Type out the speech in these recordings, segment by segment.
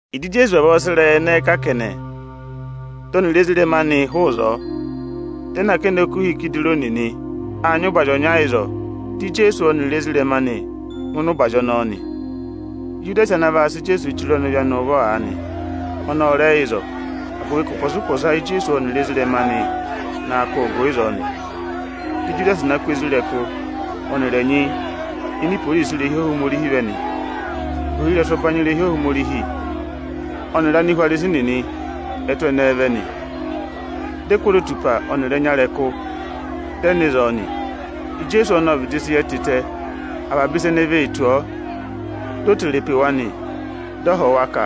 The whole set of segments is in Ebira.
Ịjị Ijeesu vavọọ sị ịrẹyị ẹnẹẹ kà kẹnẹ, dị ọnịrị ezirẹma anị hụụ ịzọọ, dị ẹ nọ akẹnẹ okuha Ikidironi nị. Â nyị ụbazị ọnya ịzọọ, dị Ijeesu ọnịrị ezirẹma anị ngụ ịnị ụbazị ọnọọ nị. Ijudasi ana vaa sị Ijeesu chire ọnịvị anị ụvọ aanị, ọnị ọ rẹ yẹ ịzọọ; agụvị ka ụpọsa-ụpọsa Íjeesu ọnịrị ezirẹma anị naa kụ́ụ gụ ịzọọ nị. Dị Ijudasi na kụ́ isoja nịnị ọnịrị ẹnyị ini iporisi irehi Ohomorihi vẹ nị. Ohirẹsụ ẹbanyị irehi Ohomorihi ọnịrị Anihwarisi nịnị ẹ tụ́ ẹnẹẹ vẹ nị. Dị ẹ kụ́ ozotupa ọnịrị ẹnya ịrẹkụ, dị ẹ nọ ịzọọ nị. Ijeesu ọnị ộ vịdị sị yẹ tịtẹ avaba ịsa ene vee tù ọọ. Di o tere pe wa nị, dị ọ họ̀ wa ka,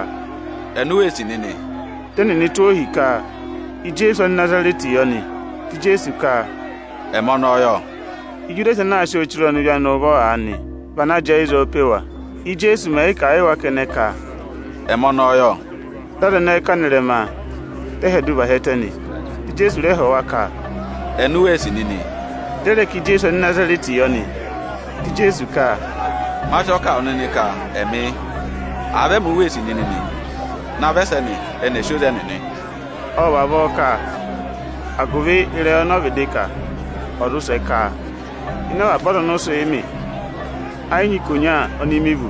“Eni u wee sì nịnị?” Dị ẹnịnị tụ́ ọọ ohi ka Ijeesu Anịnazarẹtị yọ nị. Dị Ijeesu ka, “Ẹmị ọnọọ yọ!” Ijudasi ana aa sị ọọ chire ọnịvị anị ụvọ aanị vị ana jẹẹ ịzọọ pe wa. Íjeesu mẹ̀ yị kà a yị wa kẹnẹ ka, “Ẹmị ọnọọ yọ,” dị aza ẹnẹẹ kà nọ ịrẹma, dị ẹ hyẹdụ và hi ẹtẹ nị. Dị Ijeesu rẹ họ̀ wa ka, “Eni u wee sì nịnị?” Dị ẹ rẹ ka Ijeesu Anịnazarẹtị yọ nị. Dị Ijeesu ka, “Ma sị ọọ kà a wụ nịnị ka ẹmị yị. Àa vị ẹmị u wee sì nịnị nị, navọ ẹsẹnị ẹnị ẹ̀ sị oze ẹnịnị!” Ộ vavọọ kà, agụvị ịrẹyị ọnọọ vịdị kà, ọ̀ zụ sẹ ka, “Ịnị avaba aza ọnị ụ sị mị, ẹ yị nyị ikonya oni mi vú.”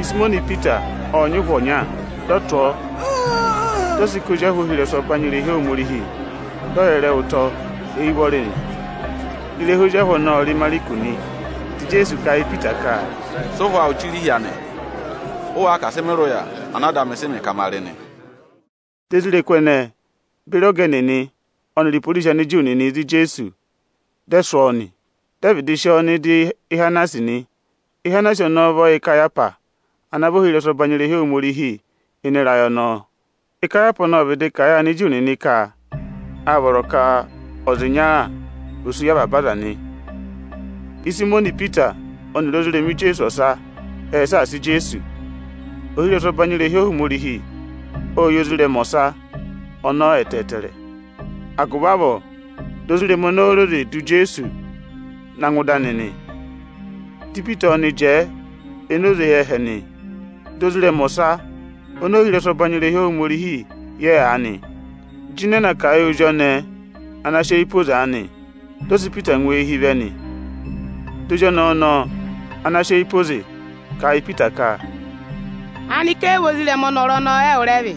Ịsayịmọnị Ipita ộ nyị ụhwọ ọnya. Dị ọ tụ̀ ọọ, dị ọ sị ká ozi ahụ ohirẹsụ ọbanyị irehi Ohomorihi, dị ọ yẹrẹ ẹ ụtọ eyi ụvọrị nị. Ịrẹha ozi ahụ ọnọọ ọ rị Ịmarịkụsị nị. Dị Ijeesu kà a yị Ipita ka, “Sị ụhwọ awụ chire ịhị anị! Ụ wáá ka asị mị rị ụya ana Ada amị sị mị ka ma rị nị?” Di isoja nịnị ẹnẹẹ beri ọga ẹnịnị ọnịrị iporisi Aniju nịnị za Ijeesu, dị ẹ sụ́ ọọ nị. Dị ẹ vịdị sị ọọ nọ ịdị Ihanasi nị. Ihanasi ọnọọ vị ọyẹ Ikayahwasi ana vị ohirẹsụ ọbanyị irehi Ohomorihi ịnị ịrayị ọnọọ. Ikayahwasi ọnọọ ọ vịdị kà a yị Aniju nịnị ka â vọrọ ka ọza ịnya ò sú yị avaba aza nị. Ịsayịmọnị Ipita ọnịrị ozirẹma Ijeesu ọsa ệ saasa Ijeesu. Ohirẹsụ ọbanyị irehi Ohomorihi ộ yẹ ozirẹma ọsa ọnọọ ẹtẹẹtẹrẹ. Agụvị avọọ, di ozirẹma ọnọọ re oze dụ Ijeesu na ngụ ịnị ohweje ịdị anị nị. Dị Ipita ọnị jẹẹ enoze éyi ẹhẹ nị. Dị ozirẹma ọsa oni ohirẹsụ ọbanyị irehi Ohomorihi yẹ aanị, jịnẹ na kà a yị ozi ọnẹẹ ana sị eyi pe oze aanị, dị ọ sị Ipita ngụ eehi vẹ nị. Dị ozi ọnẹẹ ọnọọ ana sị eyi pe oze, kà a yị Ipita ka, “Aanịka ẹ yị vị ozirẹma ọnọrụ ọnọnị ẹwụ rẹ vị?”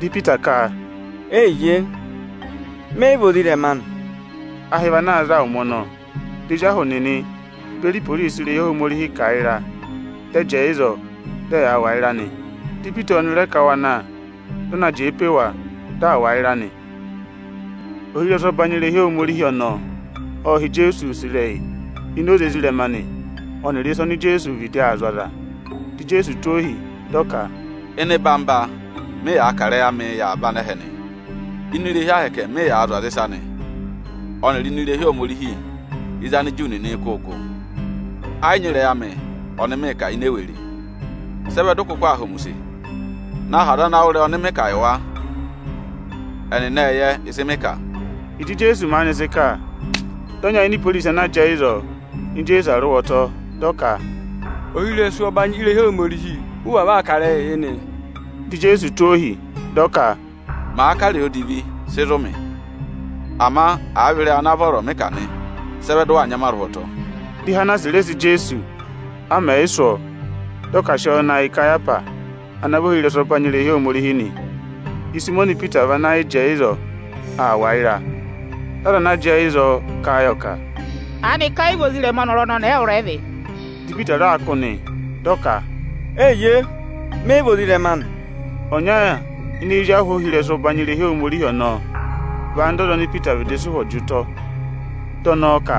Dị Ipita ka, “Eyiye, mẹ yị vị ozirẹma anị!” Ahị vị ana aa za ụmẹ ọnọọ. Dị ezi ahụ nịnị beri iporisi irehi Ohomorihi kà ịra, dị ẹ jẹẹ ịzọọ, dị ẹ yaa wà ịra nị. Di Ipita ọnị rẹ ká wa na nị, dị ọ na jẹẹ pe wa, dị aa wà ịra nị. Ohirẹsụ ọbanyị irehi Ohomorihi ọnọọ ộ họ̀ Ijeesu use ịrẹyị ini oze ezirẹma anị ọnịrị ịsa oni Ijeesu vịdị aa zụ̀ aza. Dị Ijeesu tụ́ ohi, dị ọ ka, “Ịnị eyigede mị yàā kà ịrẹyị amịị yị avaba anẹhẹ nị. Ini irehi Ohomorihi mị yàā zụ̀ aza ịsa nị, ọnịrị ini irehi Ohomorihi ịzị Aniju nịnịị̄ kụ́ gụ. Ẹ yị nyị ịrẹyị amị ọnị mịị̄ kà ini ewere. Sị ẹ vẹ dị ụ kụkụ aa họ̀ mị use? Na họ̀ aza ana wụ́ ịrẹyị ọnị mị kà yị wa! Ẹnịnị ệ yẹ ịsị mị kà.” Ịjị Ijeesu maanị sị kà, dị ọnya ini iporisi ana jẹẹ ịzọọ nya Ijeesu arụhwọtọ, dị ọ ka, “Ohirẹsụ ọbanyị irehi Ohomorihi ụ vavọọ aa kà ịrẹyịị yị nịị?” Dị Ijeesu tụ́ ọ ohi, dị ọ ka, “Màa kà ịrẹyị odivi, sị zụ̀ mị! Ama àa vị ịrẹyị ana vọrọ mị kà nị, sị ẹ vẹ dị ụ waa nya mị arụhwọtọ?” Di Ihanasi rẹ sị Ijeesu, a mẹ̀ yị sụ́ ọọ, dị ọ ka à sị ọọ na yị Ikayahwasi ana vị ohirẹsụ ọbanyị irehi Ohomorihi nị. Ịsayịmọnị Ipita va na yị jẹẹ ịzọọ aa wà ịra. Dị aza ana jẹẹ ịzọọ kà a yọ ka, “Aanịka ẹ yị vị ozirẹma ọnọrụ ọnọnị ẹwụ rẹ vị?” Dị Ipita raa kụ́ nị, dị ọ ka, “Eyiye, mẹ yị vị ozirẹma anị.” Ọnya ini ezi ahụ ohirẹsụ ọbanyị irehi Ohomorihi ọnọọ vị anda ọza oni Ipita vịdị sị ụhwọ jị ụtọ. Dị ọnọọ ka,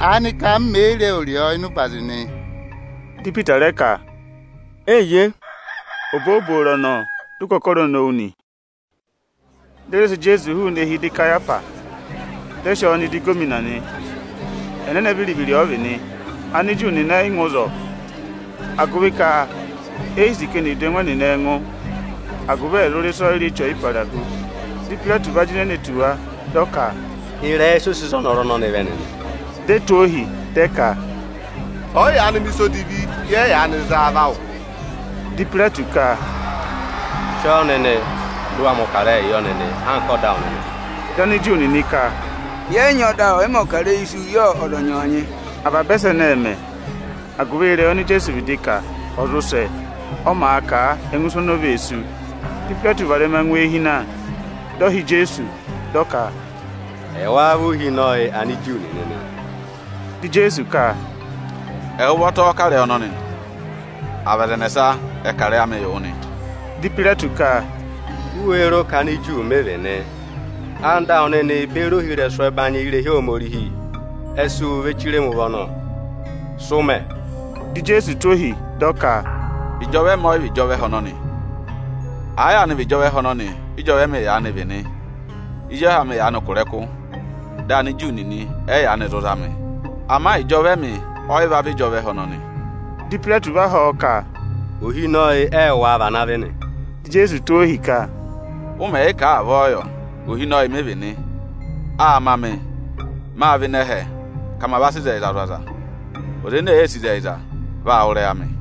“Aanịka m mè yi re ẹwụrị ọọ ịnị ụbazị nị?” Dị Ipita rẹ ka, “Eyiye.” Obooboro ọnọọ, dị ụkọkọrọ nowu nị. Dị ẹ rẹ sị Ijeesu hụụnị eehi ịdị Ikayahwasi, dị ẹ sị ọọ nọ ịdị ịgọvọnọ nị. Ẹnẹnẹ viri-viri ọ vị nị. Aniju nịnị ẹ yị ngụ ịzọọ, agụvị ka e yi sì ka eni è du ẹngụ ẹnịnị ẹngụ, agụvị ẹ̀ zụ rị ịsọyịrị Eche Ọyịparahu. Dị Ipayireti va jịnẹ ne tù wa, dị ọ ka, “Ịrẹyị ịsị ụ sị za ọnọrụ ọnọnị vẹ nịnị?” Di e tụ́ ohi, dị ẹ ka, “Ọ̀ yị yaanị mẹ̀ ịsa odivi, yẹ yị yaanị za a va wụ.” Dị Ipayireti ka, “Sị ọọ nịnị, dị ụ wa mẹ̀ ọkarẹyị yọ nịnị anka ọda awụ nịnị!” Dị Aniju nịnị ka, “Yẹ yị nyị ọda ọyịmẹ̀ ọkarẹyị isu yị ọza ọnyọọnyị.” Avaba ẹsẹnị ệ mẹ, agụvị ịrẹyị oni Ijeesu vịdị kà, ọ̀ zụ sẹ, ọ màa kà a ẹngụ isu oni o vee sú. Dị Ipayireti varẹma ngụ eehi na, dị ọ hị́ Ijeesu, dị ọ ka, “Ẹwáá vị Ohinọyị Aniju nịnị nị?” Dị Ijeesu ka, “Ẹwụ ụvọta ọ́ọ́ kà ịrẹyị ọnọnị nị, à vị aza ẹnẹsa ẹ kà ịrẹyị amị yị wụ nị?” Dị Ipayireti ka, “U wéé ro ka Aniju mị vị nị? Anda awụ nịnị beri ohirẹsụ ẹbanyị irehi Ohomorihi ẹ sị wụ ve chire mi ụvọ nọ. Sị ụ mẹ?” Dị Ijeesu tụ́ ohi, dị ọ ka, “Ịjọva ẹmị ọ yị vị ịjọva ẹhẹ ọnọnị. Àa yaanị vị ịjọva ẹhẹ ọnọnị ị́jọva ẹmị yaanị vị nị, ezi ahụ amị yaanị kụ̀ ịrẹkụ, dị Aniju nịnị ẹ yị yaanị zụ za mị. Ama ịjọva ẹmị ọ yị va vị ịjọva ẹhẹ ọnọnị.” Dị Ipayireti va họ̀ ọ ka, “Ohinọyị ẹwụ wáá vị ana vị nị?” Dị Ijeesu tụ́ ọọ ohi ka, “Ụ mẹ̀ yị kà a, avọọ yọ, ohinọyị mị vị nị. Â ma mị, mâ vẹ ịnị ẹhẹ, ka ma va sị ịzẹyịza zụ̀ aza. Ọza ene èe sì ịzẹyịza, vaa wụ́ ịrẹyị amị.”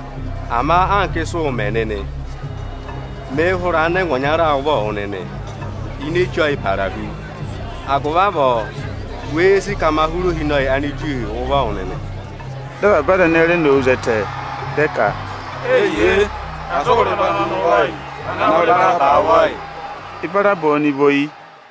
Ama anka ịsị ụụ̄ mẹ nịnị, mịị̄ hụrẹ anịnẹngwa ọnya ụvọ wụ nịnị ini Eche Ọyịparahu. Agụvị avọọ, wéé sì ka ma hụrẹ Ohinọyị Aniju ụvọ yị wụ nịnị?” Dị avaba aza ẹnẹẹ re nowu zẹtẹ, dị ẹ ka, “Eyiye, asị ụ hụrẹ ọnọrụ ọnọnị ụvọ yị; vana hụrẹ Ibaraba ụvọ yị!” Ibaraba ọnị vị oyi.